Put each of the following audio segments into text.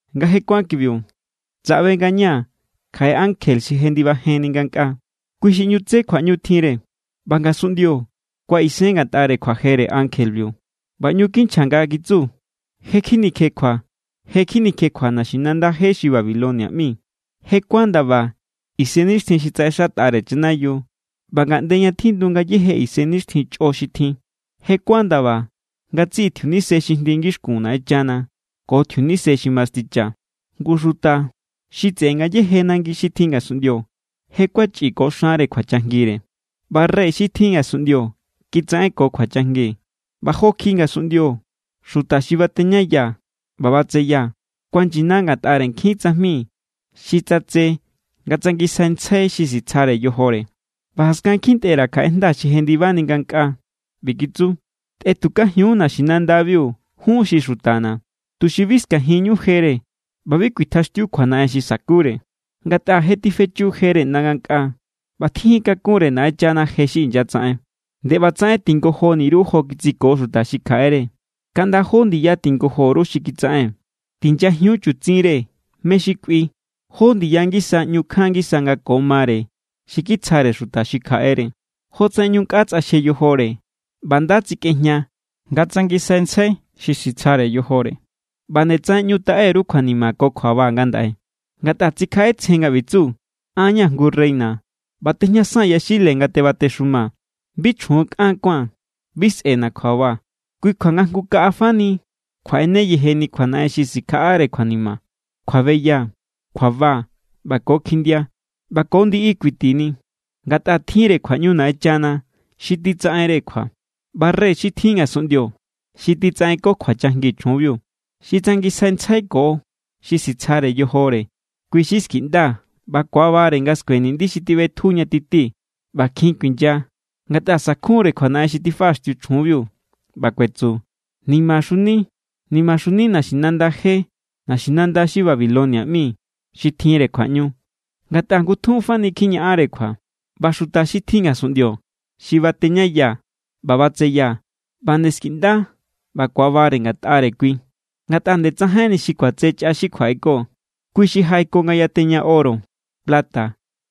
Nga je kuán kibiu, tsaꞌbe ngañaa̱ kjaꞌe ankje xi jendibajenni ngankꞌaa. Kui xi ꞌñu tse kjuaꞌñu tjinre, ꞌba ngasunꞌndio kuaꞌisen ngatꞌare kjuajere ankjebiu. ꞌBa ꞌñu kinchja nga kitsu: “Je= kjinikjekjua, je= kjinikjekjua naxinanda je xi Babilonia ꞌmi. Je kuán ndaba isennixtjin xi tsaꞌexatꞌare chanayiu ꞌba ngaꞌnde ña tjindu ngayéje isennixtjin chꞌo xi tjin. Je kuán ndaba ngatsiꞌi tjiunise xi jndi ngixkun Naꞌenchana ko tjiunise xi masticha. Ngu xuta xi tseꞌe ngayéje nangi xi tjin ngasunꞌndio je kuachꞌi ko xanre kjuachajngire. ꞌBa rey xi tjin ngasunꞌndio kitsaꞌenko kjuachajngi. ꞌBa jo kjiꞌi ngasunꞌndio xuta xi bateñaya ꞌba batseya kuanyina ngatꞌare nkjin tsajmi xi tsatse nga tsangisjaintsjai xi sitsjare yojore.” ꞌBa jaskan kjintꞌe_ra̱ kjaꞌe jnda xi jendibani ngankꞌaa. ꞌBi kitsu: “Tꞌetukajiun naxinandabiu jun xi xutana̱, tuxi bi skajinñu jere ꞌba bi kuitjaxtiu kjuanaꞌen xi sa̱kure. Ngatꞌa je tifechu jere ꞌnda ngankꞌaa, ꞌba tjijin kakun=re Naꞌenchana je xi inyatsaꞌen. ’Nde ꞌbatsaꞌen tingojoni_ru jo kitsiko xuta xi kjaꞌere. Kaꞌnda jó ndiya tingojo_ru xi kitsaꞌen. Tinyajiun chutsinre mé= xi kꞌui, jó ndiya ngisa ꞌñu kjan ngisa nga ko mare xi kitsjare xuta xi kjaꞌere. Jotsaꞌen ꞌñu nkꞌa tsꞌaxje yojore ꞌba nda tsikꞌejña nga tsangisjaintsjai xi sitsjare yojore, ꞌba nde tsaꞌen ꞌñu taꞌe_ru kjuanima ko kjuaba ngandaꞌe. Ngatꞌa tsikjaꞌetsjen nga ꞌbi tsu: An=ña̱ jngu reina ꞌba tejñasaa̱n yaxile nga tebatexumaa̱. Bi chjun kꞌan kuáa̱n. Bi sꞌe̱na̱ kjuaba. Kui= kjua nga jngu kaꞌa fani kjuaꞌene yejeni kjuanaꞌen xi sikjaꞌare kjuanima: kjuabeya, kjuaba ꞌba ko kjindia. ꞌBa ko ndiꞌi kuitini, ngatꞌa tjinre kjuaꞌñu Naꞌenchana xi titsaꞌenre kjua.” ꞌBa rey xi tjin ngasunꞌndio xi kitsaꞌenko kjuachajngi chjunbiu, xi tsangisjaintsjaiko xi sitsjare yojore, kui xi skiꞌnda ꞌba ku̱abare nga skue niꞌndi xi tiꞌbetju ña tití. ꞌBa kjin kuinya, ngatꞌa sa̱kjunre kjuanaꞌen xi tifaꞌaxtiu chjunbiu, ꞌba kuetsu: “¡Nimaxuni, nimaxuni naxinanda je, naxinanda xi Babilonia ꞌmi xi tjinre kjuaꞌñu! Ngatꞌa ngutjun fani kjiñaꞌanre kjua.” ꞌBa xuta xi tjin ngasunꞌndio xi bateñaya ꞌba batseya ꞌba nde skiꞌnda ꞌba ku̱abare ngatꞌare kui, ngatꞌa nde tsajainni xi kuatse chꞌa xi kjuaꞌeko. Kui= xi jaꞌeko nga yateña oro, plata,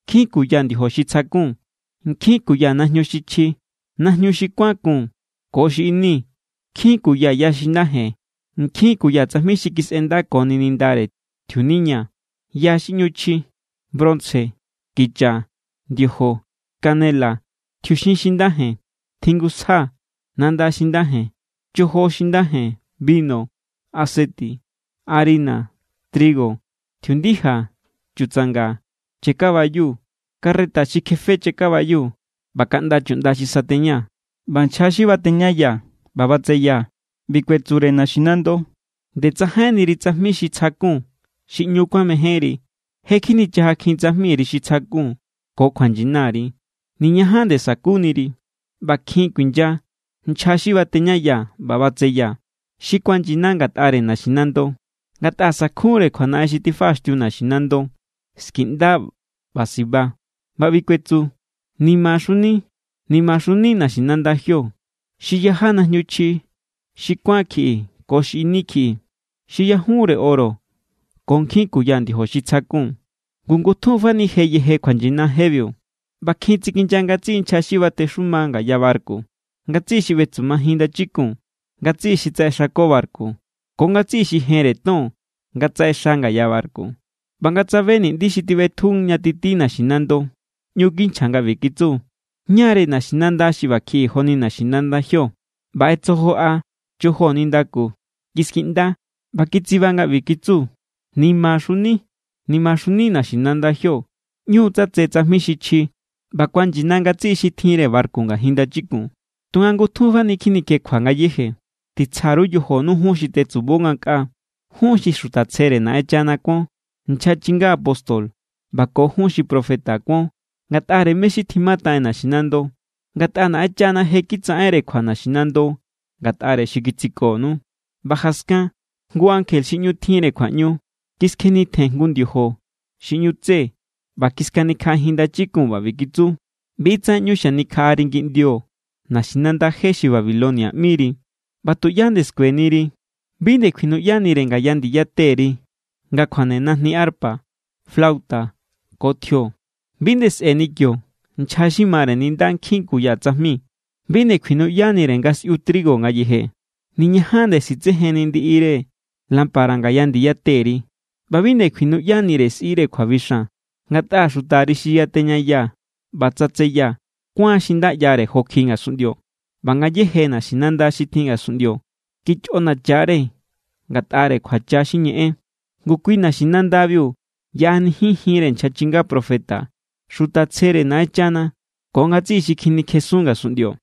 nkjin kuya ndiojo xi tsjakun, nkjin kuya najñu xi chji, najñu xi kuán kun ko xi ini, nkjin kuya ya xi nda jen, nkjin kuya tsajmi xi kisꞌendakoni nindare tjiuniña, ya xi ꞌñu chji, bronce, kicha, ndiojo, canela, tjiuxin xi nda jen, tjingusja, nanda xi nda jen, chojo xi nda jen, binu, aseti, harina, trigo, tjiundija, chutsanga, chakabayu, carreta xi kjefe chakabayu, ꞌba kaꞌnda chuꞌnda xi sateña. ꞌBa nchja xi bateñaya ꞌba batseya ꞌbi kuetsure naxinando: “¡Nde tsajainniri tsajmi xi tsjakun xi ꞌñu kuamejénri! ¡Je= kjinichajakjin tsajmiri xi tsjakun ko kjuanyinari! ¡Niñajan nde sa̱kuniri!” ꞌBa kjin kuinya nchja xi bateñaya ꞌba batseya, xi kuanyina ngatꞌare naxinando, ngatꞌa sa̱kjunre kjuanaꞌen xi tifaꞌaxtiu naxinando. Skiꞌnda ꞌba siba nga ꞌbi kuetsu: “¡Nimaxuni, nimaxuni naxinanda jio! Xi yaja najñu chji xi kuán kjiꞌi ko xi ini kjiꞌi, xi yajunre oro ko nkjin kuya ndiojo xi tsjakun. Ngu ngutjun fani je yeje kjuanyina jebiu.” ꞌBa kjin tsikinya ngatsiꞌi nchja xi batexuma ngaya barku, ngatsiꞌi xi ꞌbetsumajin ndachikun, ngatsiꞌi xi tsaꞌexako barku, ko ngatsiꞌi xi jenre ton nga tsaꞌexa ngaya barku. ꞌBa nga tsabe niꞌndi xi tiꞌbetju ña titi naxinando, ꞌñu kinchja nga ꞌbi kitsu: “¿Ñá=re naxinanda xi ꞌba kjiꞌi joni naxinanda jio?” ꞌBa ꞌetsojoꞌa chojo nindaku, kiskiꞌnda, ꞌba kitsiba nga ꞌbi kitsu: “¡Nimaxuni, nimaxuni naxinanda jio! ꞌÑu= tsatse tsajmi xi chji, ꞌba kuanyina ngatsiꞌi xi tjinre barku ngajin ndachikun. Tunga ngutjun fani kjinikjekjua ngayéje.” Titsja_ru yojonu jun xi tetsubo ngankꞌaa, jun xi xuta tsjere Naꞌenchana kuon, nchja chinga apóstol ꞌba ko jun xi profeta kuon ngatꞌare mé= xi tjimataꞌen naxinando. Ngatꞌa Naꞌenchana je= kitsaꞌenre kjua naxinando ngatꞌare xi kitsikonu. ꞌBa jaskan jngu ankje xi ꞌñu tjinre kjuaꞌñu kiskjenitjen jngu ndiojo xi ꞌñu tse ꞌba kiskanikjaꞌajin ndachikun nga ꞌbi kitsu: “ꞌBi= tsaꞌen ꞌñu xanikjaꞌari ngiꞌndio naxinanda je xi Babilonia ꞌmiri, ꞌba tuꞌyá nde skueniri. Bi nde kjuinuꞌyanire ngaya ndiya teri nga kjuane najni arpa, flauta ko tjio. Bi nde sꞌe̱ni kio nchja xi mare ninda nkjin kuya tsajmi. Bi nde kjuinuꞌyanire nga sꞌiu trigo ngayeje. Niñajan nde sitsejenni ndiꞌire lámpara ngaya ndiya teri ꞌba bi nde kjuinuꞌyanire sꞌire kjuabixan, ngatꞌa xutari xi yateñaya ꞌba tsatseya kuán xi nda ꞌyare jo kjiꞌi ngasunꞌndio, ꞌba ngayéje naxinanda xi tjin ngasunꞌndio kichꞌonacha=re ngatꞌare kjuacha xi ñeꞌen.” Ngu kui naxinandabiu yaꞌanijin jinre nchja chinga profeta, xuta tsjere Naꞌenchana ko ngatsiꞌi xi kjinikjesun ngasunꞌndio.